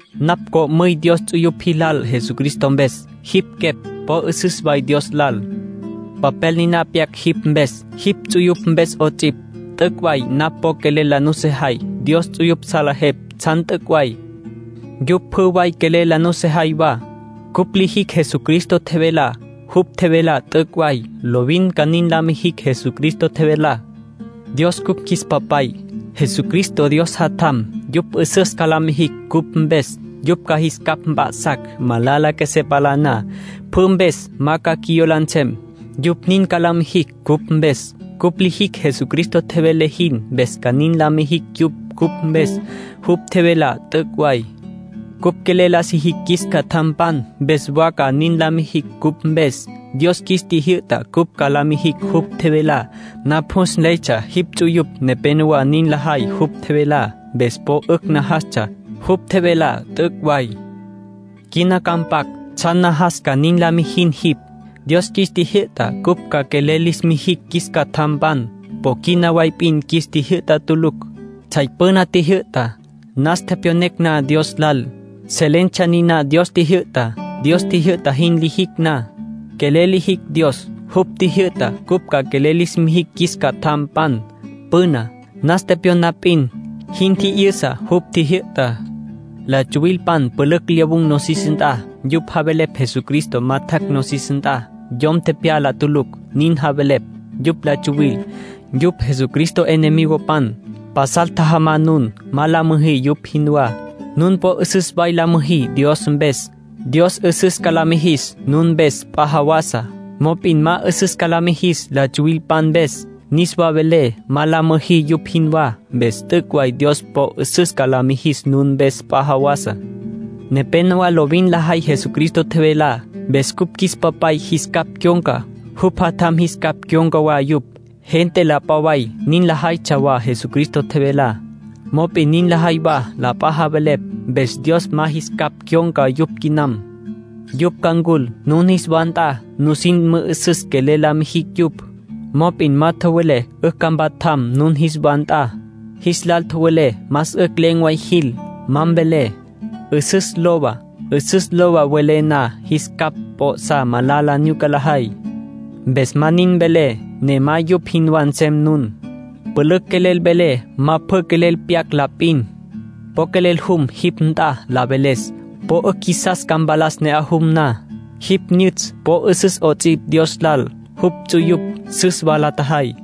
Napj co'müy Dios ts'uyupj jilal Jesucristo mpes. Jipj quepj po 'üsüs way Dios lal. Papel niná pyac jipj mpes, jipj ts'uyupj mpes 'ots'ipj. T'üc' way napj po quelel la nusejay. Dios ts'uyupj salejepj tsjan t'üc' way. Yupj pjü way quelel la nusejay wa. Cupj lijicj Jesucristo tjevelá. Jupj tjevelá t'üc' way. Lovin ca nin la mijicj Jesucristo tjevelá. Dios cupj qjuis Papay. Jesucristo Dios Jatjam. Yupj 'üsüs ca la mijicj cupj mpes. Yupj ca qjuis capj mp'a'sacj, malala qjuesé palá na. Pjü mpes ma ca qjuiyola nsem, yupj nin ca la mijicj cupj mpes. Cupj lijicj Jesucristo tjevele jin, mpes ca nin la mijicj yupj cupj mpes. Jupj tjevelá t'üc' way. Cupj quelel la sijicj qjuis catjampan, mpes wa ca nin la mijicj cupj mpes. Dios qjuis tjijyü'ta cupj ca la mijicj jupj tjevelá. Napj jus nleytsja jipj ts'uyupj nepenowá nin lajay jupj tjevelá. Mpes po 'ücj najastsja. Jupj tjevelá t'üc' way. Quina ca mpac tsjan najas ca nin la mijin jipj. Dios qjuis tjijyü'ta cupj ca quelel lis mijicj qjuis catjampan. Po quina way p'in qjuis tjijyü'ta tulucj. Tsjay püna tjijyü'ta. Nas tepyon na Dios lal, selentsja niná Dios tjijyü'tá. Dios tjijyü'ta jin lijicj na, quelel lijicj Dios. Jupj tjijyü'ta cupj ca quelel lis mijicj qjuis catjampan. Püna, nas tepyon na p'in, jin tji'yüsa jupj tjijyü'tá. La tsuwilpan pülücj lyawun̈ nosis nt'a. Yupj javelepj Jesucristo ma tjac' nosis nt'a, yom tepyala tulucj, nin javelepj. Yupj la tsuwil. Yupj Jesucristo enemigopan. Pasal tjajama nun. Ma la müjí yupj jinwá. Nun po 'üsüs way la müjí Dios mpes. Dios 'üsüs ca la mijis nun mpes p'a jawasa. Mop'in ma 'üsüs ca la mijis la tsuwilpan mpes. Niswa velé, ma la müjí yupj jinwá. Mpes t'üc' way Dios po 'üsüs ca la mijis nun mpes p'a jawasa. Nepénowa lovin lajay Jesucristo tjevelá. Mpes cupj qjuis Papay jis capj cyon̈ca. Jupj Jatjam jis capj cyon̈ca wa yupj. Gente la p'a way nin la jaytsja wa Jesucristo tjevelá. Mop'in nin lajay wa la p'a wa javelepj. Mpes Dios ma jis capj cyon̈ca yupj quinam. Yupj ca ncul nun jis wa nt'a, nusin mü'üsüs quelel la mijicj yupj. Mop'in ma tjowelé 'ücj ca mpatjam nun jis wa nt'a. Jis lal tjowelé más 'ücj len̈ way jil. Ma mvelé: “'Üsüs lowa”. “'Üsüs lowa” welé na, jis capj p'o'sá malala nyuca lajay. Mpes ma nin mvelé, ne ma yupj jinwá nsem nun. Pülücj quelel velé. Ma pjü quelel pyac la p'in. Po quelel jum jipj nt'a la veles. Po 'ücj qjuisas ca mpalas ne'aj jum na. Jipj nyütsj po 'üsüs 'ots'ipj Dios lal. Jupj ts'uyupj süs wa la tjajay.